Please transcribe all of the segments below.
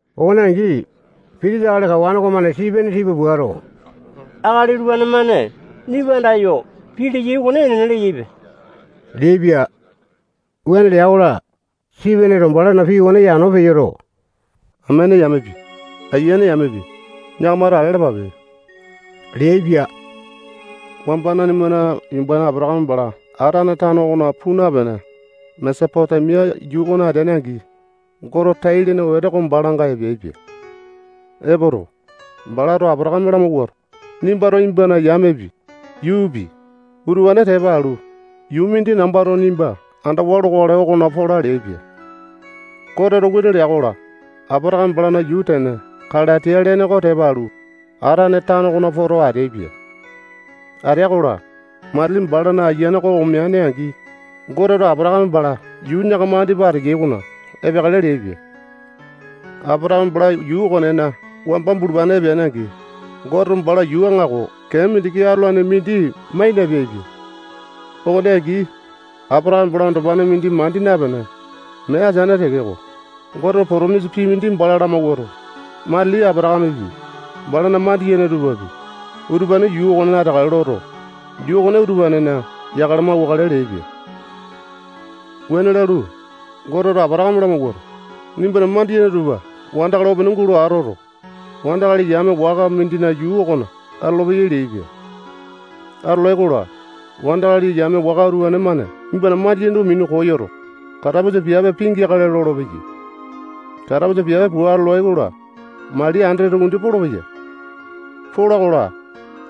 Okone angi, pitisa akali kawane okomane Sipene tipa puato, akali utupane-mane nimba andayo pii leyai okone enene leyaipe leaipia. Wuane lea-kola, Sipeneto balana pii okone yano peyoto, amene yamepi, ayiane yamepi, yakamato ale alapape leaipia. Wamba nanimana yumbane Apatakame bala Atane tano okona puu napene, Mesopotemia yuu okona ateane-angi, Gote tai-lene wete oko balanga epeaipia. Epoto, balato Apatakame lamawuato, nimbato nimbana yamepi, yuupi, utupane tepa alu, yuu mindi nambato nimba andawa lokale okona pola leaipia. Goteto wuane lea-kola, Apatakame balana yuu tene Kalatiya lene oko tepa alu, Atane tano okona poto ateaipia. Atea-kola, matili balana ayiane oko omeane-angi, Goteto Apatakame bala yuu yakama andipa ateyai okona epeakale leaipia. Apatakame bala yuu okonena wamba bulupane epeane-angi, Goteto bala yuu aŋako kee mindiki atolanepi mindi mai napeaipia. Okone angi, Apatakame bala andopane mindi mandi napene, mee ateane tekeko, Goteto potomisa pii mindi bala lamawuato, matili Apatakamepi, balana mandiyene tupapi, utupane yuu okonena ateakale loto, yuu okone utupanena yakale mauwakale leaipia. Wuane lalu, Goteto Apatakame lamawuato, nimbana mandiyene tupa wandakali opene gulo atoto, wandakali yame waka mindina yuu okona atolopeyai leaipia. Atolai-kola, wandakali yame waka utupane-mane nimbana mandiyene tupa minu koyoto, katapusa piape pingeakale lolopeyai. Katapusa piape pua atolai-kola, mali andete tukumindi polopeya. Pola-kola,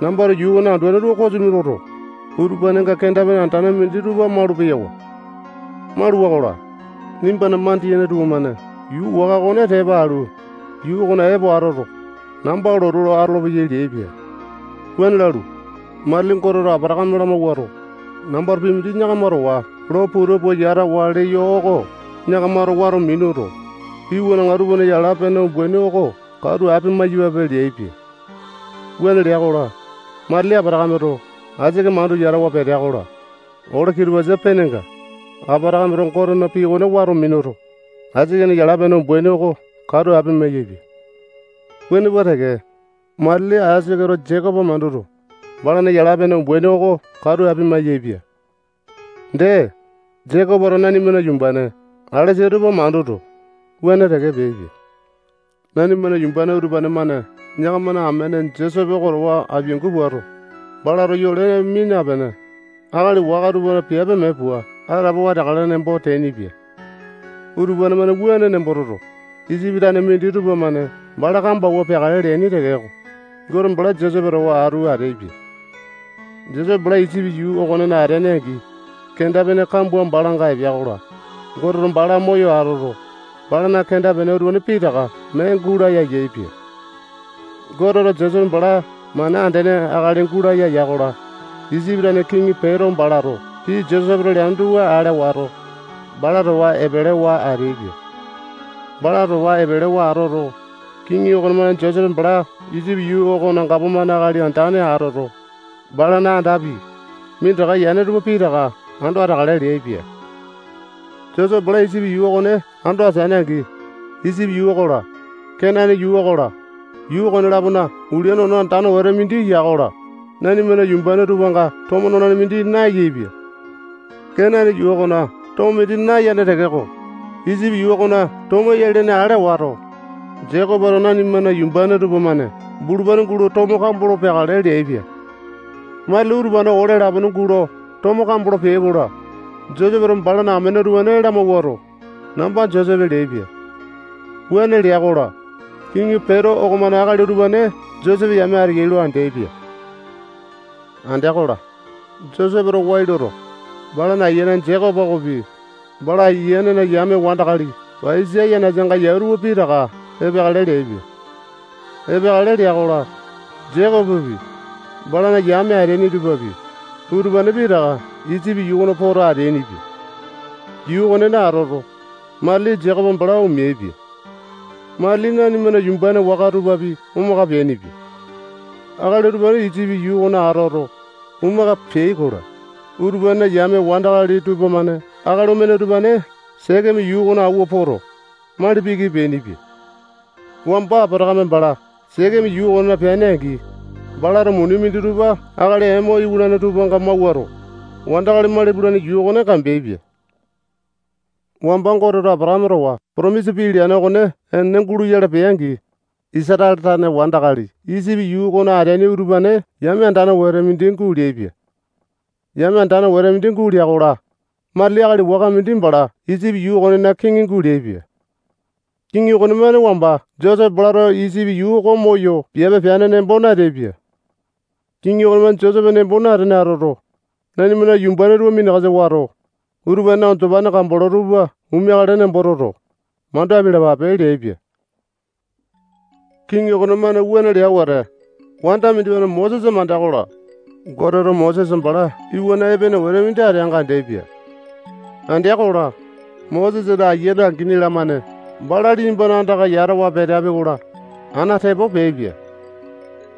nambato yuu okona anduane tupa kosimi loto, utupanenga kenda-pene andane minditupa malu-peyawa. Maluwa-kola, nimbana mandiyene tupamane yuu waka okone tepa alu, yuu okona epo atoto, namba lotu lo atolopeyai leaipia. Wuane lalu, matili Goteto Apatakame lamawuato, nambato pii mindi yakama towa lo puta pua yatawa leyo oko yakamato wato minuto, iwanaŋa tupana yala-pene umbaini oko katu apia-maiyapape leaipia. Wuane lea-kola, matili Apatakameto Aisake mandu yatawa petea-kola, ole kitupasa penenga, Apatakameto Gotena pii okone wato minuto, Aisakena yala-pene umbaini oko katu apia-maiyaepia. Wuane pua teke, matili Aisaketo Jekopo manduto, balana yala-pene umbaini oko katu apia-maiyaepia. Dee, Jekopoto nanimana yumbane alesa tupa manduto, wuane teke peaipia. Nanimana yumbane utupane-mane yakamana amene Josepe oko towa apiangu puato, balato yole mia napene, akali waka tupana piape mee pua atapowa ateakale nembo teainipia. Utupane-mane wuane nembo toto, Isipi tane minditupa-mane bala kambo awua peakale leaini tekeko, Gote bala Josepe towa atu ateaipia. Josepe bala Isipi yuu okonena ateane-angi, kenda-pene kambua balanga epea-kola, Goteto bala moyo atoto, balana kenda-pene utupane pitaka mee gulaya yaepia. Goteto Josepe bala mana andene akali gulaya ya-kola, Isipi tane kiŋi Peto balato pii Josepeto leane tupa ale wato, bala towa epelewa ateaipia. Bala towa epelewa atoto, kiŋi okonemane Josepe bala Isipi yuu okona gapomane akali andane atoto, balana andapi, minditaka yane tupa pitaka ando ateakale leaipia. Josepe bala Isipi yuu okone ando ateane-angi, Isipi yuu okola, Kenane yuu okola, yuu okone-lapona ulia nono andane wete mindi ya-kola, nanimana yumbane tupanga tomo nolane mindi nayaepia. Kenane yuu okona tomo mindi nayane tekeko, Isipi yuu okona tomo eya lene ale wato, Jekopoto nanimana yumbane tupamane bulupane gulo tomo kambolo peakale leaipia. Matili utupane ole lapone gulo tomo kambolo peai-kola, Josepeto balana amene utupane lamawuato, namba Josepe leaipia. Wuane lea-kola, kiŋi Peto okomane akali utupane Josepe yame ateya lo andeaipia. Andea-kola, Josepeto wai loto, balana ayiane Jekopo okopi, bala ayianena yame wandakali paiyasa yanasanga yau tupa pitaka epeakale leaipia. Epeakale lea-kola, Jekopopi, balana yame ateaini tupapi, utupane pitaka Isipi yuu okona poto ateainipia. Yuu okonena atoto, matili Jekopo bala omeaipia. Matili nanimana yumbane waka tupapi omaka peainipia. Akali utupane Isipi yuu okona atoto, omaka peai-kola, utupanena yame wandakali tupamane akali omene utupane Sekeme yuu okona awua poto, mali piki peainipia. Wamba Apatakame bala Sekeme yuu okonena peane-angi, balato muni minditupa akali Emo iwanane tupanga mawuato, wandakali mali pulane yuu okone kambeaipia. Wamba Goteto Apatakame towa potomisa pii leane okone enene guloyale pea-angi, Isatale tane wandakali Isipi yuu okona ateaini utupane yame andane wete mindi guleaipia. Yame andane wete mindi gulea-kola, matili akali waka mindi bala Isipi yuu okonena kiŋi guleaipia. Kiŋi okonemane wamba Josepe balato Isipi yuu oko moyo piape peane nembo nateaipia. Kiŋi okonemane Josepe nembo natene atoto, nanimana yumbane tupa minakasa wato, utupanena andopane kambolo tupa omeakale nembo toto, mandu apialapape leaipia. Kiŋi okonemane wuane lea wete, wanda mindimane Mosesa mandea-kola, Goteto Mosesa bala iwana epene wete mindi ateanga andeaipia. Andea-kola, Mosesana Ayiane angini-lamane bala liyambana andaka yatawa peteapi-kola, ana tepo peaipia.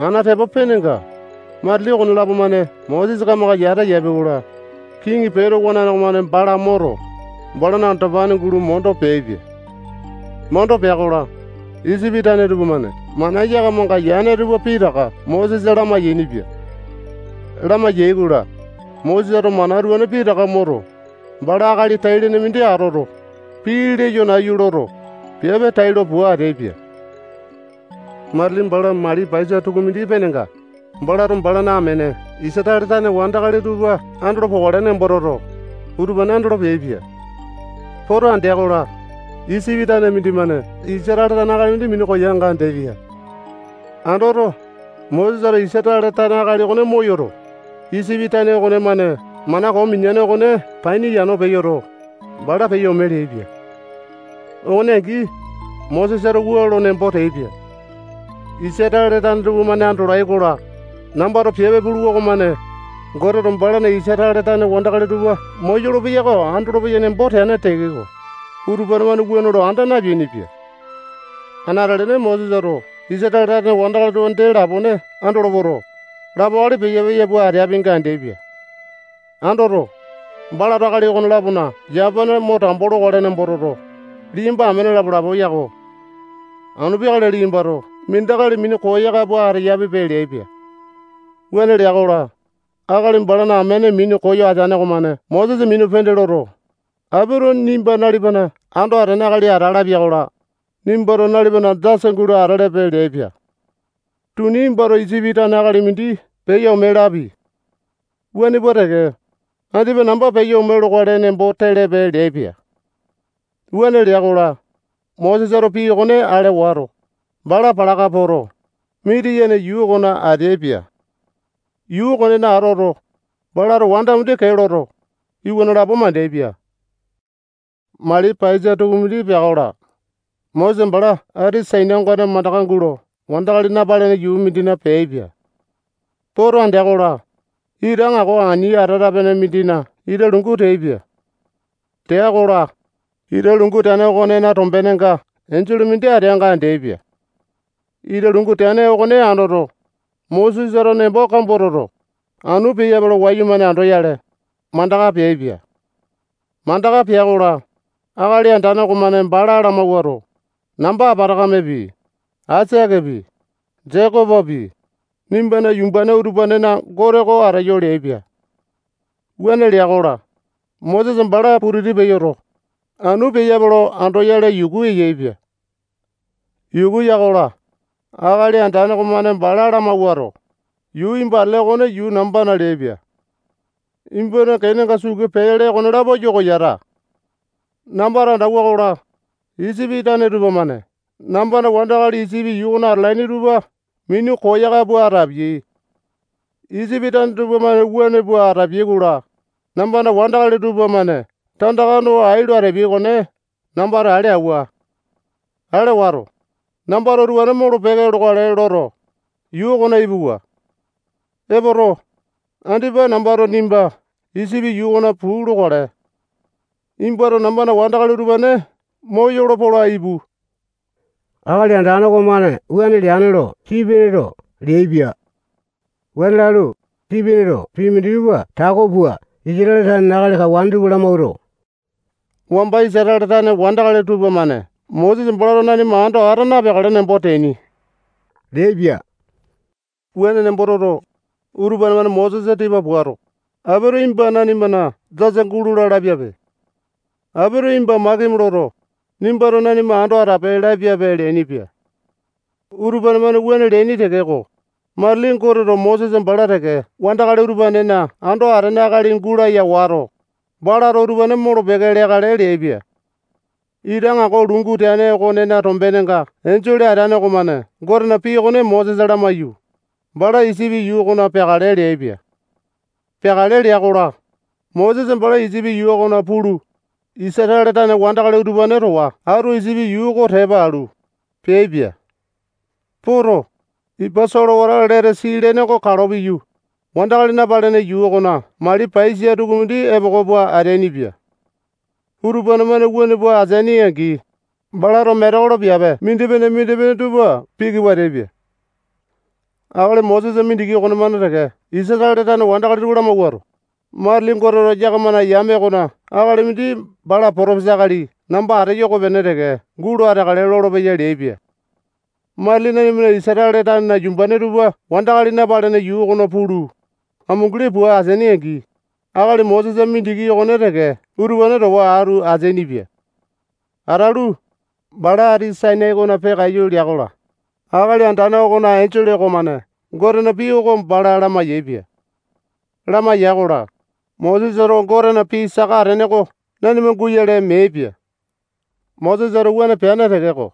Ana tepo penenga, matili okonelapo-mane Mosesa kamaka yata yapi-kola, kiŋi Peto wanane okomane bala moto, balana andopane gulo mondo peaipia. Mondo pea-kola, Isipi tane tupamane mana yakamanga yane tupa pitaka Mosesa lamai-yainipia. Lamai-yaikola, Mosesato mana utupane pitaka moto, bala akali tai-lene mindi atoto, pii leyo nayu loto, piape tailo pua ateaipia. Matili bala mali paiyasa tukumindi penenga, balato balana amene Isatale tane wandakali tupa andolo pokale nembo toto, utupane andolo peaipia. Poto andea-kola, Isipi tane mindimane Isatale tane akali mindi minu koyanga andeaipia. Andoto, Mosesato Isatale tane akali okone moyoto, Isipi tane okonemane mana koo mineane okone paini yano peyoto, bala peyo ome leaipia. Okone angi, Mosesato wua lo nembo teaipia: Isatale tane tupamane andolai-kola, nambato piape puluwa okomane, Goteto balana Isatale tane wandakali tupa moyolo-peya oko andolopeyai nembo teane tekeko, utupane-mane wuane lo anda napeainipia. Anate-lene Mosesato Isatale tane wandakali tupa dee lapone andolo poto, lapo akali peya-peya pua ateapinga andeaipia. Andoto, balato akali okone-lapona yamapane mo tambo lokale nembo toto, liyamba amene lapo-lapo yako. Anu peakale liyambato mindi akali minu koyaka pua ateyapipe leaipia. Wuane lea-kola, akali balana amene minu koyo ateane okomane Mosesa minu pende loto, apito nimba nalipana ando atene akali ata lapia-kola, nimbato nalipana jasa gulo atelepe leaipia. Tuni nimbato Isipi tane akali mindi peyo ome lapi. Wuane pua teke, andipa namba peyo ome lokale nembo telepe leaipia. Wuane lea-kola, Mosesato pii okone ale wato, bala palaka poto, Mitiyane yuu okona ateaipia. Yuu okonena atoto, balato wanda mindi kee loto, iwana lapo mandeaipia. Mali paiyasa tukumindi pea-kola, Mosesa bala ati Sainai ongane mandaka gulo wandakali napalene yuu mindina peaipia. Poto andea-kola, ita aŋako ani atata-pene mindina ita lungu teaipia. Tea-kola, ita lungu teane okonena tombenenga enjole mindi ateanga andeaipia. Ita lungu teane okone andoto, Mosesato nembo kambua toto, anu peyape lo wayumane andoyale, mandaka peaipia. Mandaka pea-kola, Akali Andane okomane bala lamawuato, namba Apatakamepi, Aisakepi, Jekopopi, nimbana yumbane utupanena Gote oko ateyo leaipia. Wuane lea-kola, Mosesa bala putiti peyoto, anu peyape lo andoyale yuku yaepia. Yuku ya-kola, Akali Andane okomane bala lamawuato, yuu nimba atele okone yuu nambana leaipia. Nimbana kenenga sukee pele okonelapo yoko yata. Nambato andauwa-kola, Isipi tane tupamane nambana wandakali Isipi yuu okona atalaini tupa minu koyaka pua atapiai. Isipi tane tupamane wuane pua atapiai-kola, nambana wandakali tupamane tandaka no ai lo atapiai okone nambato ale awua. Ale wato, nambato utupane molo-peke lokale loto, yuu okona ipuwa. Epoto, andipa nambato nimba Isipi yuu okona puu lokale. Nimbato nambana wandakali utupane moyolo pola ipu. Akali Andane okomane wuane leane lo Sipeneto leaipia. Wuane lalu, Sipeneto pii minditupa tako pua Isatale tanena akali kawane tupa lamawuato, wamba Isatale tane wandakali tupamane Mosesa balato nanima ando ata napeakale nembo teaini leaipia. Wuane nembo toto, utupane-mane Mosesa tipa puato, apito nimba nanimana jasa gulola lapiape. Apito nimba makimi loto, nimbato nanima ando atape lapiape leainipia. Utupane-mane wuane leaini tekeko, matili Goteto Mosesa bala teke wandakali utupanena ando atene akali gulaya wato, balato utupane molo-peke leakale leaipia. Ita aŋako lungu teane okonena tombenenga enjole ateane okomane Gotena pii okone Mosesa lamaiyu, bala Isipi yuu okona peakale leaipia. Peakale lea-kola, Mosesa bala Isipi yuu okona pulu, Isatale tane wandakali utupane towa atu Isipi yuu oko tepa alu, peaipia. Poto, ipa solewata Letesi lene oko kalo piyu, wandakali napalene yuu okona mali paiyasa tukumindi epoko pua ateainipia. Utupane-mane wuane pua ateaini-angi, balato metekolo piape mindipene-mindipene tupa piki pua ateaipia. Akali Mosesa mindiki okonemane teke Isatale tane wandakali tupa lamawuato, matili Goteto yakamana yame okona akali mindi bala potopesa akali namba ateyo okopene teke gulo ateakale lolopeya leaipia. Matili nanima Isatale tanena yumbane tupa wandakali napalene yuu okona pulu, amunguli pua ateaini-angi, akali Mosesa mindiki okone teke utupane towa atu ateainipia. Atalu, bala ati Sainai okona peakaiyu lea-kola, Akali Andane okona enjole okomane Gotena pii oko bala lamai-yaepia. Lamaiya-kola, Mosesato Gotena pii saka atene oko nanima guyale meaipia. Mosesato wuane peane tekeko,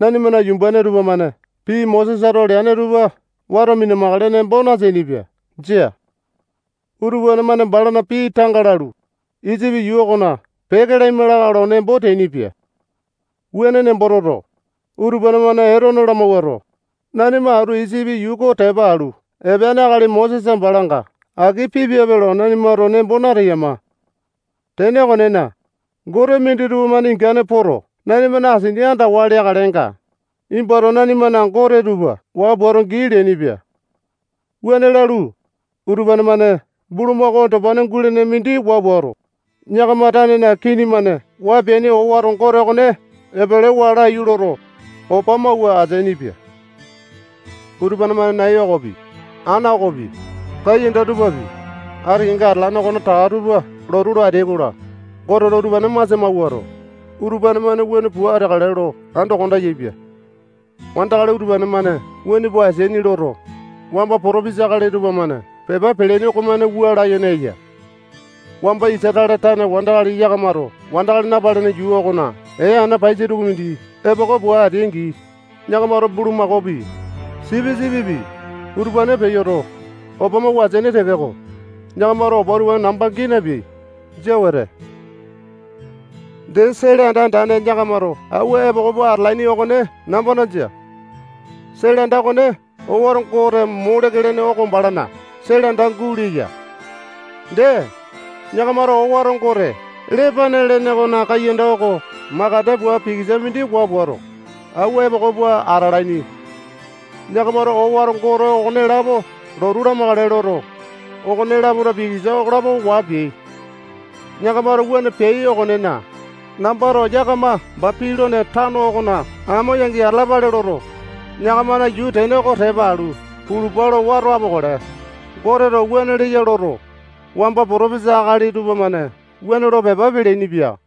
nanimana yumbane tupamane pii Mosesato leane tupa wato mina-makale nembo nateainipia. Jia. Utupane-mane balana pii tanga lalu, Isipi yuu okona peke laima lakae lo nembo teainipia. Wuane nembo toto, utupane-mane Etone lamawuato, nanima atu Isipi yuu oko tepa alu epeane akali Mosesa balanga aki pipiape lo nanimato nembo nateyama. Tene okonena, gote minditupa-mane ingane poto, nanimana asini andawa leakalenga, nimbato nanimana gote tupa waa puato gii leainipia. Wuane lalu, utupane-mane bulumako andopane gulene mindi waa puato, yakama tanena kini-mane waa peaini owato gote okone epelewa laiyu loto, opa mawua ateainipia. Utupane-mane nai okopi, ana okopi, kaiyanda tupapi, ati kenga atalane okonetaka tupa lotu lo ateai-kola, Goteto utupane masia mawuato, utupane-mane wuane pua ateakale lo ando konda yaepia. Wandakali utupane-mane wuane pua ateaini loto, wamba potopesa akali tupamane pepa peleaini okomane wua layene eya: Wamba Isatale tane wandakali yakamato wandakali napalene yuu okona ee ana paiyasa tukumindi epoko pua ateai-angi, yakamato bulumakaopi, sipisipipi, utupane peyoto, opa mawua ateaini tekeko, yakamato opa utupane namba gii napeai. Jia wete. Dee, sele anda andane yakamato awua epoko pua atalaini okone nambana jia. Sele anda okone owato gote Moleke lene oko balana sele anda guleya. Dee, yakamato owato gote Lepane lene okona kaiyanda oko makande pua pikisa mindi waa puato, awua epoko pua atalaini. Yakamato owato gote okonelapo lotu lamakale loto, okone-lapona pikisa okolapo waa peai. Yakamato wuane peai okonena, nambato yakama Bapilone tano okona amo yangi atalapale loto, yakamana yuu tene oko tepa alu pulupa lo wato apokale. Goteto wuane leya loto, wamba potopesa akali tupamane wuane lo pepa peleaini-pia.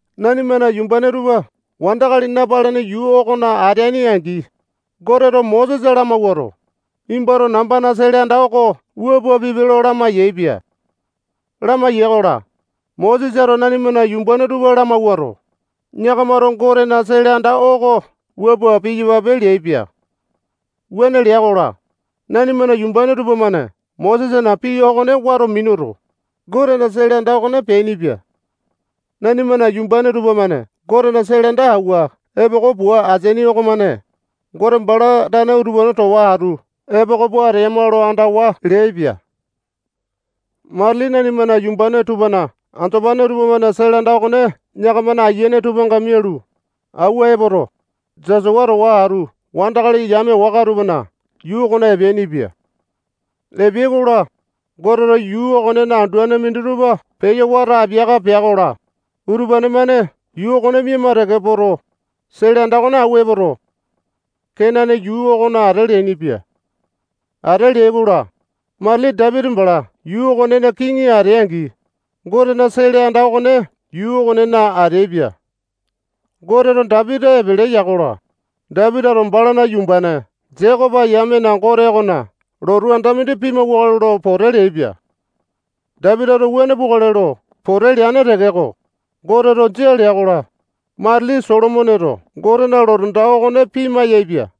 Nanimana yumbane tupa wandakali napalene yuu okona ateaini-angi, Goteto Mosesa lamawuato, nimbato nambana sele anda oko wua pua pipe lo lamai-yaepia. Lamaiya-kola, Mosesato nanimana yumbane tupa lamawuato, yakamato Gotena sele anda oko wua pua piyapape leaipia. Wuane lea-kola, nanimana yumbane tupamane Mosesana pii okone wato minuto, Gotena sele anda okone peainipia. Nanimana yumbane tupamane Gotena sele anda awua epoko pua ateaini okomane, Gote bala tane utupane towa atu epoko pua ateyama lo andawa leaipia. Matili nanimana yumbane tupana andopane tupamane sele anda okone yakamana Ayiane tupanga mialu, awua epoto, Jasua towa atu wandakali yame waka tupana yuu okona epeainipia. Epeai-kola, Goteto yuu okonena anduane minditupa peyo wato apiaka pea-kola, utupane-mane yuu okone miama teke poto, sele anda okone awua epoto, Kenane yuu okona ate leainipia. Ate leai-kola, matili Dapiti bala yuu okonena kiŋi atea-angi, Gotena sele anda okone yuu okonena ateaipia. Goteto Dapiti epele ya-kola, Dapitito balana yumbane Jekopo yamena Gote okona lotu anda mindi pimawakale lo pote leaipia. Dapitito wuane pukale lo pote leane tekeko, Goteto jia lea-kola, matili Solomoneto Gotena lotu anda okone pima-yaepia.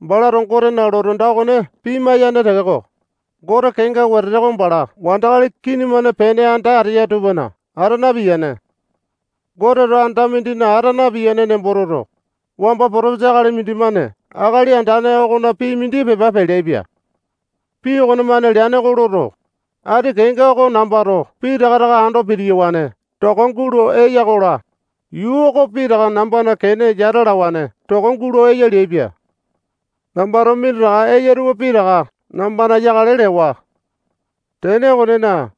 Balato Gotena lotu anda okone pima-yane tekeko, Gote kenga wetete oko bala wandakali kini-mane pene anda ateya tupana ata napiyane. Goteto anda mindina ata napiyane nembo toto, wamba potopesa akali mindimane Akali Andane okona pii mindi pepa peleaipia. Pii okonemane leane oko loto, ati kenga oko nambato pitaka taka ando pitiyawane toko gulo eya-kola, yuu oko pitaka nambana kene yata alawane toko gulo eya leaipia. Nambato minditaka eya tupa pitaka nambana yakale lewa. Tene okonena,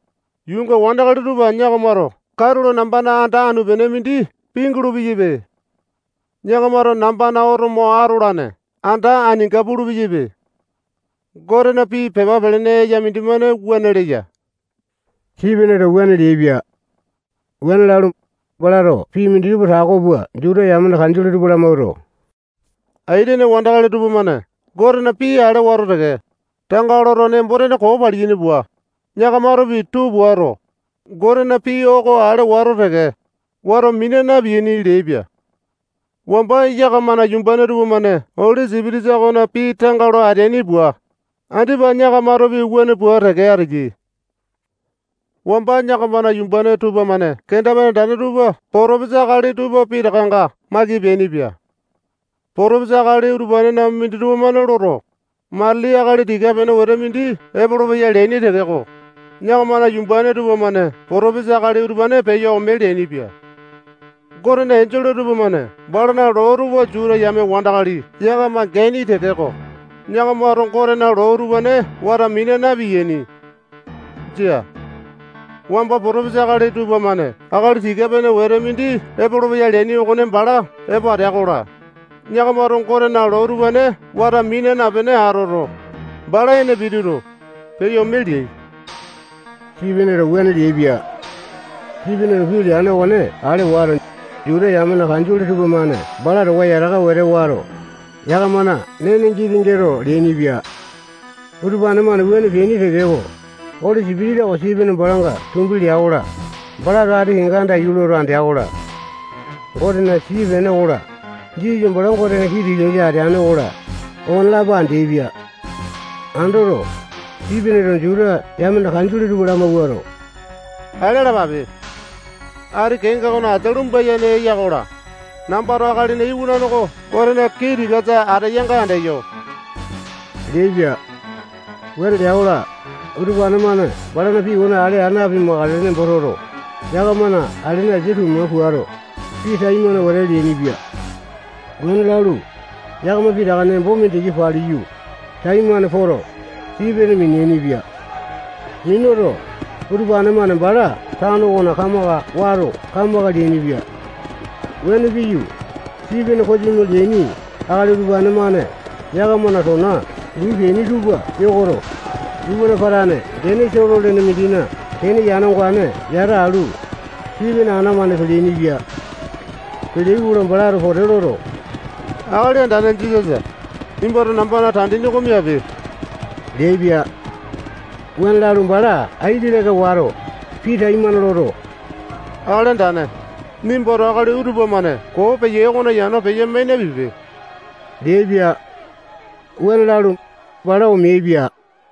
yuunga wandakali tupa yakamato katulo nambana anda anu-pene mindi pingulu-peyaipe. Yakamato nambana oto mo atolane anda aninga pulu-peyaipe. Gotena pii pepa pelene eya mindimane wuane leya. Sipeneto wuane leaipia. Wuane lalu, balato pii minditupa tako pua Juta yamena kanjole tupa lamawuato, aitene wandakali tupamane Gotena pii ale wato teke, tanga loto, nembo-tene koo paliyaini pua, yakamatopi tuu puato, Gotena pii oko ale wato teke, wato mina na-piyaini leaipia. Wamba yakamana yumbane tupamane Oli Sipitisa okona pii tanga lo ateaini pua, andipa yakamatopi wuane pua teke ateyai. Wamba yakamana yumbane tupamane kenda-pene andane tupa potopesa akali tupa pitakanga maiki peainipia. Potopesa akali utupanena minditupa-mane loto, matili akali tika-pene wete mindi epolopeya leaini tekeko, yakamana yumbane tupamane potopesa akali utupane peyo ome leainipia. Gotena enjole tupamane balana loo tupa Juta yame wandakali yakama geaini tekeko, yakamato Gotena loo utupane wato mina na-piyaini. Jia. Wamba potopesa akali tupamane akali tika-pene wete mindi epolopeya leaini okone bala epo atea-kola, yakamato Gotena loo utupane wato mina napene atoto, bala ene pituto, peyo ome leai. Sipeneto wuane leaipia. Sipeneto pii leane okone ale wato, Juta yamena kanjole tupamane bala towa yataka wete wato, yakamana nene giti-gete leainipia. Utupane-mane wuane peaini tekeko, Oli Sipitisa oko Sipene balanga tumbi lea-kola, balato ati kenga andaiyu loto andea-kola, Gotena tii-pene okola, Jisasa bala Gotena kii tikasa ateane okola, okonelapo andeaipia. Andoto, Sipeneto Juta yamena kanjole tupa lamawuato, ale alapape. Ati kenga okona asia lumba-yene eya-kola, nambato Akalina Iwanane oko Gotena kii tikasa ateyanga andeyo leaipia. Wuane lea-kola, utupane-mane balana pii okone ale aa napimakale nembo toto, yakamana alene asia tuma puato, pii taimane wete leainipia. Wuane lalu, yakama pitaka nembo mindiki paliyu, taimane poto, Sipene miniaini-pia. Minuto, utupane-mane bala tano okona kamaka wato kamaka leainipia. Wuane piyu, Sipene kosimi leaini akali utupane-mane yakamana tona luu peaini tupa yokoto, iwana patane gene Solo lene mindina kene yane ongane yata alu, Sipene ana-mane peleaini-pia. Peleai-kola, balato pote loto, Akali Andane Jisasa, nimbato nambana tandini oko miape leaipia. Wuane lalu, bala aiki leka wato, pii taimane loto, Akali Andane, nimbato akali utupa-mane koo peyai okona yano peya-mai napipe leaipia. Wuane lalu, bala omeaipia.